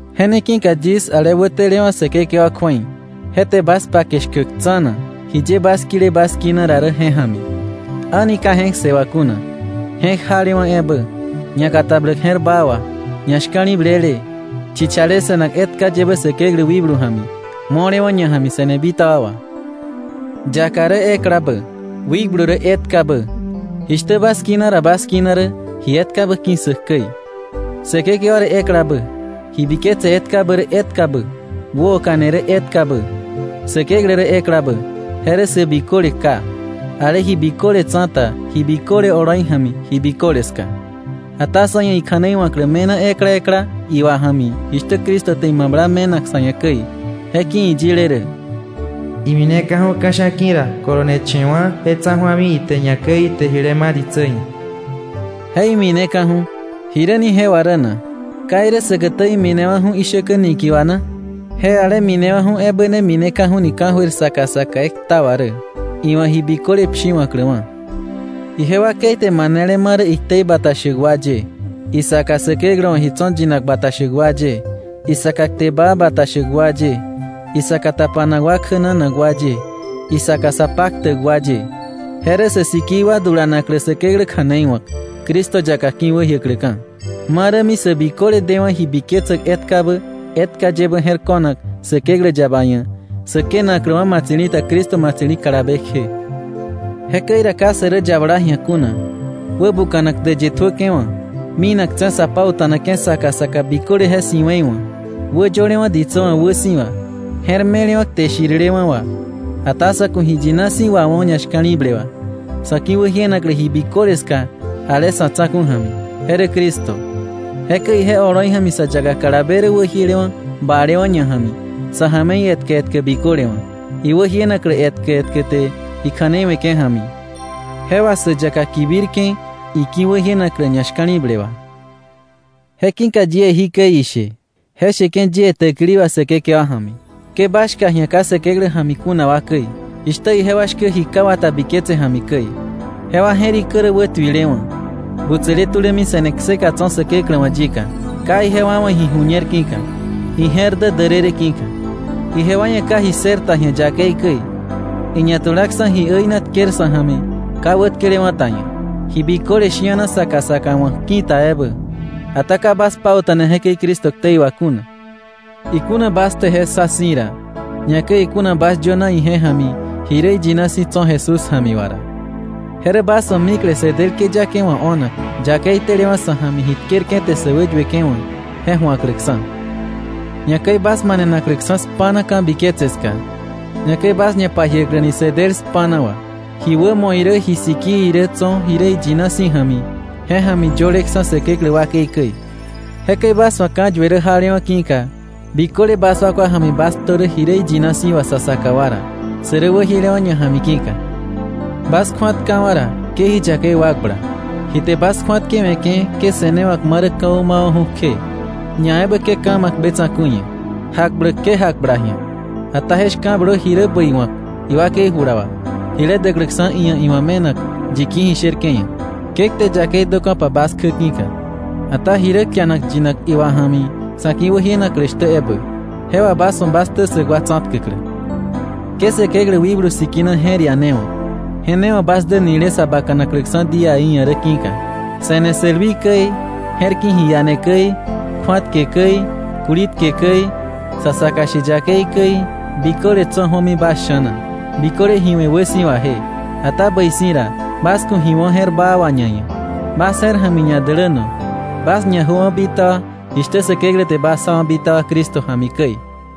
Je ne ki̱ka yis, ale wätelewa̱ Säkekewa kju̱ei, je te bas pake shkäk tsa̱na, jiye bas kile bas kina ra rä je ja̱mi, a̱ni ka je̱k ssë wà kuna, je̱k jalewa̱ ebä, ñakatabläk je̱r baa wà, ñashka̱li̱blele, chichale se̱nak etka yebä Säkeklä wikblu ja̱mi, mo̱lewa̱ ñaja̱mi se̱ne bitaba wà. Yaka rä eklabä, wikblu rä etkabä, jishtä bas kina ra bas kina rä ji etkabä ki̱ssäk käi, Säkekewa rä eklabä, ji biketse etkabä rä etkabä, wäoka̱ne rä etkabä, Säkeklä rä eklabä, je rä sä biköle Ká, ale ji biköle tsa̱ta, ji biköle oloi ja̱mi, ji biköle ska. Ata sa ia̱ ikja̱nei wa̱klä me̱na ekla ekla iwa ja̱mi jishtä Cristo te imabla me̱nak sa̱ ia̱ käi. Je ki̱ iyile rä: “Imineka̱ju̱ ka̱sha̱ ki̱ ra, koloneche̱wa̱ je tsa̱ju̱ami ite ñakäi ite jile ma̱ ditsä ia̱.” Je “imineka̱ju̱”, ¿jiräni je wà rä na? ¿Ka irä säkätä iminewa̱ju̱ ishäkä niki̱ wà na? Je ale minewa̱ju̱ ebä ne mineka̱ju̱ni ka̱jöir saka saka ekta wà rä, iwa̱ ji biköle pshiwa̱kläwa̱. Ije wakei te manele ma̱ rä iktei bata shäk wa ye, isaka Säkeklä wa̱ ji tso̱ yinak bata shäk wa ye, isaka kte baa bata shäk wa ye, isaka tapanak wa kjänanak wa ye, isaka sa paktäk wa ye. Je rä sä sikii wa dulanaklä Säkeklä kja̱nei wa̱k, Cristo yaka ki̱wäjiäkläka̱, ma rämi sä biköle dewa̱ ji biketsäk etkabä etka yebä je̱r ko̱nak Säkeklä yaba ia̱, sä kënakläwa̱ ma̱tsi̱li̱ ta Cristo ma̱tsi̱li̱ kalabe kje. Jekäi ra ka sä rä yabala ji̱a kuna, wäbuka̱nak däyë tjuäke̱ wa̱, minaktse̱ sa pauta̱nake̱ saka saka biköle je si̱we̱i wa̱, wäyölewa̱ ditsä wa̱ wäsi̱wa, je̱r me̱lewa̱ kte shirilewa̱ wà. Ata sa̱ ku̱ ji yina si̱ wawo̱ ñashka̱li̱ble wà, sa̱ ki̱wäjienaklä ji biköle ska ale sa̱ tsa̱ku̱ ja̱mi, je rä Cristo. Jekäi ije oloi ja̱mi sä yaka kalabe rä wäjielewa̱ balewa̱ ñaja̱mi sa̱ ja̱me̱i etkä etkä biköle wa̱, iwäjienaklä etkä etkä te ikja̱nei we̱ke̱ ja̱mi, je wà sä yaka kibirke̱ iki̱wäjienaklä ñashka̱li̱ble wà. Je ki̱ka yie jikäi ishe, je sheke̱ yie täkili wà Säkekewa ja̱mi: Ke bas shka ji̱a ka Säkeklä ja̱mi kuna wa käi, jishtä ijewa shkä ji ka wata biketse ja̱mi käi. Jewa je̱rikä rä wätuilewa̱, butsäle tulämi se̱ne kseka tso̱ Säkeklä wa̱ yika, ka ijewa wa̱ ji ju̱ñer ki̱ka, ije̱r dä därërë ki̱ka. Ijewa ia̱ ka ji ssër ta ji̱a yakei käi, iñatulaksa̱ ji äina tker sa̱ ja̱mi ka wätkelewa̱ ta ia̱, ji biköle shi̱ana saka saka wa̱k ki̱ta ebä. Ata ka bas pauta̱ne jekäi Cristo ktei wà kuna, ikuna bas te je ssa si̱ ra, ñakäi ikuna bas yöna ije ja̱mi ji rä iyina si̱ tso̱ Jesús ja̱mi wà ra. Je rä bas wa̱ mikle sä del këyake wa̱ o̱nak, yakei telewa̱ sa̱ ja̱mi ji tkerke̱ te sä wäyueke̱ wa̱, je ju̱akläksa̱, ñakäi bas manenakläksa̱ spa̱na ka̱biketse ska, ñakäi bas ñapajiäkläni sä del spa̱na wà, ji wämo irä ji sikii irä tso̱ ji rä iyina si̱ ja̱mi, je ja̱mi yöleksa̱ Säkeklä wakei käi. Jekäi bas wa̱ ka̱yue jalewa̱ ki̱ka, biköle bas wakwa ja̱mi bas ktö ji rä yina si̱ wà sa saka wa ra, sä rä wäjiele ñaja̱mi ki̱ka. Bas kju̱atkawa̱ ra, ke ji yakei wakbla. Ji te bas kju̱atkewe̱ke̱ ke se̱newa̱k ma rä ka̱wä mawa̱ju̱ kje, ñaebä ke ka̱ ma̱k be tsa̱ku̱i ia̱. Jakbläk ke jakbla ji̱a, ata je shka̱blö ji rä bäi wa̱k iwakei jula wà jile däkläksa̱ iia̱ iwa̱ me̱nak yi ki̱ ji sherke̱ ia̱. Ke kte yakei döka̱pa bas kjä ki̱ka, ata ji rä kianak yinak iwa ja̱mi sa̱ ki̱wäjienaklä shtä ebä, je wà bas wa̱ bas ktä ssäk wa tsa̱tkäklä. Ke Säkeklä Wikblu Sikina je̱r ianewa̱k, je ne wa̱ bas dä nile sa bakanakläksa̱ díaí ia̱ rä ki̱ka. Se̱ne sälwii käi, je̱r ki̱ ji iane käi, kju̱atke käi, kulitke käi, sa saka she yakei käi, biköle tso̱ ju̱omi bas sha̱na, biköle ji we̱ wäsi̱waje. Ata bäi si̱ ra, bas ku̱ ji wo̱ je̱r baa wà ñaia̱. Bas je̱r ja̱mi ñadäläno. Bas ñajöwa̱ bitaba jishtä Säkeklä te bas jawa̱ bitaba Cristo ja̱mi käi.